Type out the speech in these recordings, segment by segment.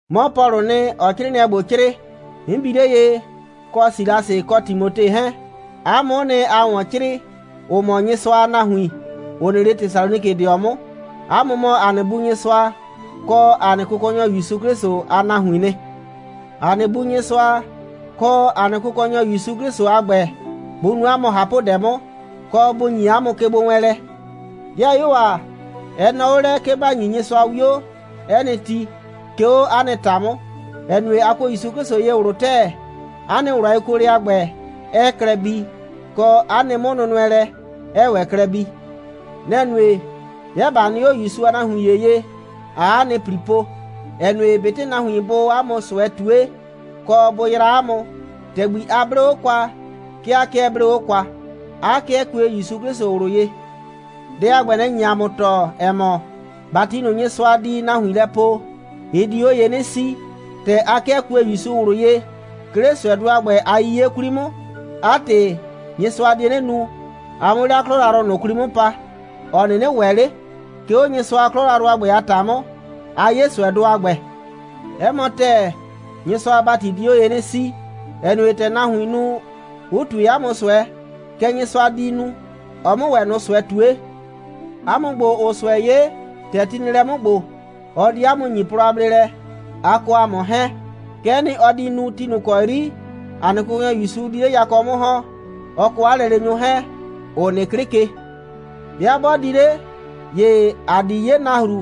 'Mɔ Pɔlʋʋ nɩ, ‑ɔɔ 'crɩɩnɩɛ ‑gbo 'crɩɩ, 'n bi 'le ye, kɔ Silasɩ kɔ Timote 'hɛɛn. 'A mʋ'ʋ nɩ, ‑aa ‑wɔn 'crɩɩ, ‑ʋ mɔ Nyɩsʋa a nahuin, ‑ʋ nɩ 'le Tesalonikɩdɩɔ 'mʋ. 'A mʋ mɔ ‑a nɩ Bu Nyɩsʋa kɔ ‑a nɩ Kʋkɔnyɔ ‑Yusu 'Klɩsʋ a nahuiin nɩ. ‑A nɩ Bu Nyɩsʋa kɔ ‑a nɩ Kʋkɔnyɔ ‑Yusu 'Klɩsʋ a ‑gbɛ, bʋ nu 'a mʋ ꞊hapʋdɛ 'mʋ, kɔ bʋ ‑nyi 'a mʋ kegbowɛɛnlɛ. 'Dɩayuo ‑a, ɛ nɔɔ 'o lɛ, 'ke ‑ba ‑nyi Nyɩsʋa 'wio 'ɛ nɩ ti, 'ke 'o 'a nɩ ‑ta 'mʋ, ‑ɛ nue, a kuo ‑Yusu ye ꞊wlʋ ‑tɛɛ, 'a nɩ ꞊wlʋ a yekuolɛ a ‑gbɛ, 'ɛɛ klɛ bii, kɔ, 'a nɩ 'mʋnʋnʋɛlɛ, 'ɛɛ ‑wɛ klɛ bii. Nɛ‑ nue, 'bɩa ꞊ba nɩ 'o ‑Yusu a nahuin ‑ye ye, ꞊aa 'a nɩ ‑pli po, ‑ɛ nue, ꞊betɩ nahuin bʋʋ 'a mʋ ꞊sʋɛ ꞊tue, kɔ, bʋ yraa 'a mʋ, ‑tɛgbi a 'blee 'o kwa, 'ke a 'kɩɛ 'blee 'o kwa, 'a 'kɩɛ kue ‑Yusu 'Klɩsʋ ꞊wlʋ ye. Dɛ a ‑gbɛ, nɛ‑ nye ‑a mʋ tɔɔ, ‑ɛ mɔ, ‑bati ꞊nʋ, Nyɩsʋa di nahuin lɛ poo, ɩ di 'o ye 'nɩ 'sii. ‑Tɛ a 'kɩɛ kue ‑Yusu ꞊wlʋ ye, 'ke 'le ꞊sʋɛdʋ a ‑gbɛ a 'yiye 'kwli 'mʋ, 'a ‑tɩ, Nyɩsʋa die 'nɩ nu, a 'mʋ 'le 'a 'klɔ yrayrʋ ꞊nʋ 'kwli 'mʋ pa, ‑ɔ 'nɩnɩ ‑wɛ 'le. 'Ke 'o Nyɩsʋa a 'klɔ yrayrʋ a ‑gbɛ a ‑ta 'mʋ, aa 'ye ꞊sʋɛdʋ a ‑gbɛ. 'Ɛ mɔ ‑tɛɛ, Nyɩsʋa a ‑bati di 'o ye 'nɩ 'sii, ‑ɛ nue, ‑tɛ nahuiin nu, 'ʋ ꞊tue 'a mʋ ꞊sʋɛ, kɛ Nyɩsʋa di nu, ɔ 'mʋ ‑wɛ ꞊nʋ ꞊sʋɛ ꞊tue. 'A mʋ ‑gbo, ‑ʋʋ ꞊sʋɛ 'ye, ‑tɛ ti nɩ lɛ 'mʋ ‑gbo, ɔ di 'a mʋ ‑nyi plɔ a bleelɛ, a kɔ ‑a mʋ 'hɛɛn. Kɛ'ɛ nɩ, ɔ di nu ti ꞊nʋ ‑kɔ 'yri ‑a nɩ Kʋkɔnyɔ ‑Yusu di 'le yakɔ 'mʋ ‑hɔn, ɔ kɔ 'a lɛleenyʋ ꞊nʋ 'hɛɛn, ‑ʋ nɩ 'klɩ ke. 'Bɩa 'bɔɔ 'le di, ‑ye ‑a di 'ye nahru,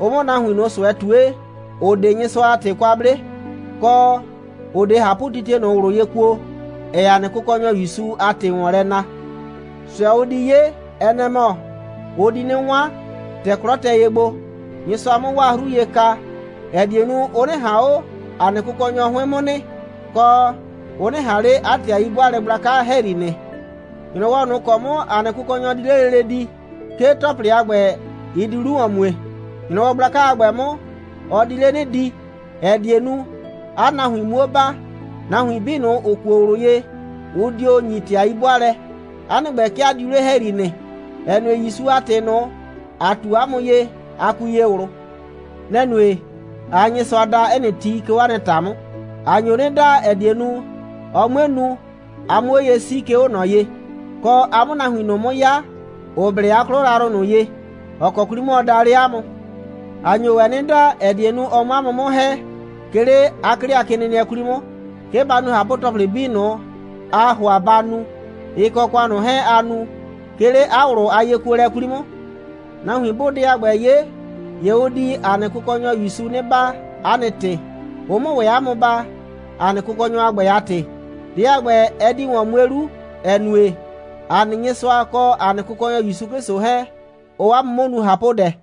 ɔ 'mʋ nahuin ꞊nʋ ꞊sʋɛ ꞊tue, ‑ʋ 'de Nyɩsʋa a ‑tɩ kwa 'ble, kɔ, ‑ʋ 'de ꞊hapʋtitie ꞊nʋ ꞊wlʋ ye kuo, ‑ɛɛ ‑a nɩ Kʋkɔnyɔ ‑Yusu a ‑tɩ ‑wɔn lɛ na. ꞊Sʋɛ, ʋ di 'ye, ɛ nɛ‑ mɔ: ʋ di 'nɩ 'wan, ‑tɛ 'klɔ tɛ ye gbo, Nyɩsʋa 'mʋ 'waa 'hru ye ka, ‑ɛ die nu, ʋ 'nɩ ꞊han 'o ‑a nɩ Kʋkɔnyɔ 'hʋɩn 'mʋ nɩ, kɔ, ʋ 'nɩ ꞊han 'le 'a ‑tɩ a 'yi'bʋaalɛ gblaka ‑hɛyri nɩ. ‑Nyrɔwɔ ꞊nʋ ‑kɔ 'mʋ ‑a nɩ Kʋkɔnyɔ di 'le lele di, 'ke ‑tɔplɩ a ‑gbɛ, ɩ di 'lu ‑wɔn mue. ‑Nyrɔwɔ gblaka a ‑gbɛ 'mʋ, ɔ di 'le 'nɩ di, ‑ɛ die nu, 'a nahuin 'muo baa. Nahuin 'bii ꞊nʋ, ‑ʋ kuo ꞊wlʋ ye, ʋ dio ‑nyi ‑tɩ a 'yi'bʋaalɛ. 'A nɩ ‑gbɛ, 'ke a diu 'le ‑hɛyri nɩ, ‑ɛ nue, ‑Yusu a ‑tɩ ꞊nʋ, ‑a ꞊tu 'a mʋ ye, a kui ye ꞊wlʋ. Nɛ‑ nue, ꞊aa Nyɩsʋa da 'ɛ nɩ ti, 'ke 'o 'a nɩ ‑ta 'mʋ. ‑A nyo 'nɩ da, ‑ɛ die nu, ɔ 'mue nu, a 'mʋ 'o ye 'sii, 'ke 'o ꞊nɔ ye, kɔ, a 'mʋ nahuin ꞊nʋ 'mʋ 'ya, ‑ʋ blɛ 'a 'klɔ yrayrʋ ꞊nʋ ye, ‑ɔ kɔ 'kwli 'mʋ ɔ daa 'le 'a mʋ. ‑A nyo ‑wɛ 'nɩ da, ‑ɛ die nu, ɔ 'mʋ 'a mʋ 'mʋ ‑hɛ, 'ke 'le 'a 'klɩkenɩnɩɛ 'kwli 'mʋ, 'ke ba nu ꞊hapʋ‑tɔplɩ 'bii ꞊nʋ, aa ‑hʋa ba nu, ɩ kɔ ‑kʋan ꞊nʋ 'hɛɛn, aa nu, 'ke 'le 'a ꞊wlʋ a yekuolɛ 'kwli 'mʋ. Nahuin 'bʋʋ dɛ a ‑gbɛ 'ye, ‑ye ʋ di ‑a nɩ Kʋkɔnyɔ ‑Yusu 'nɩ baa 'a nɩ ‑tɩ, ʋ 'mʋ ‑wɛ 'a mʋ baa, ‑a nɩ Kʋkɔnyɔ a ‑gbɛ a ‑tɩ. Dɛ a ‑gbɛ, ɛ di ‑wɔn mue 'lu, ‑ɛ nue, ‑a nɩ Nyɩsʋa kɔ ‑a nɩ Kʋkɔnyɔ ‑Yusu 'Klɩsʋ 'hɛɛn, ʋʋ 'a mʋ 'mʋ nu ꞊hapʋdɛ.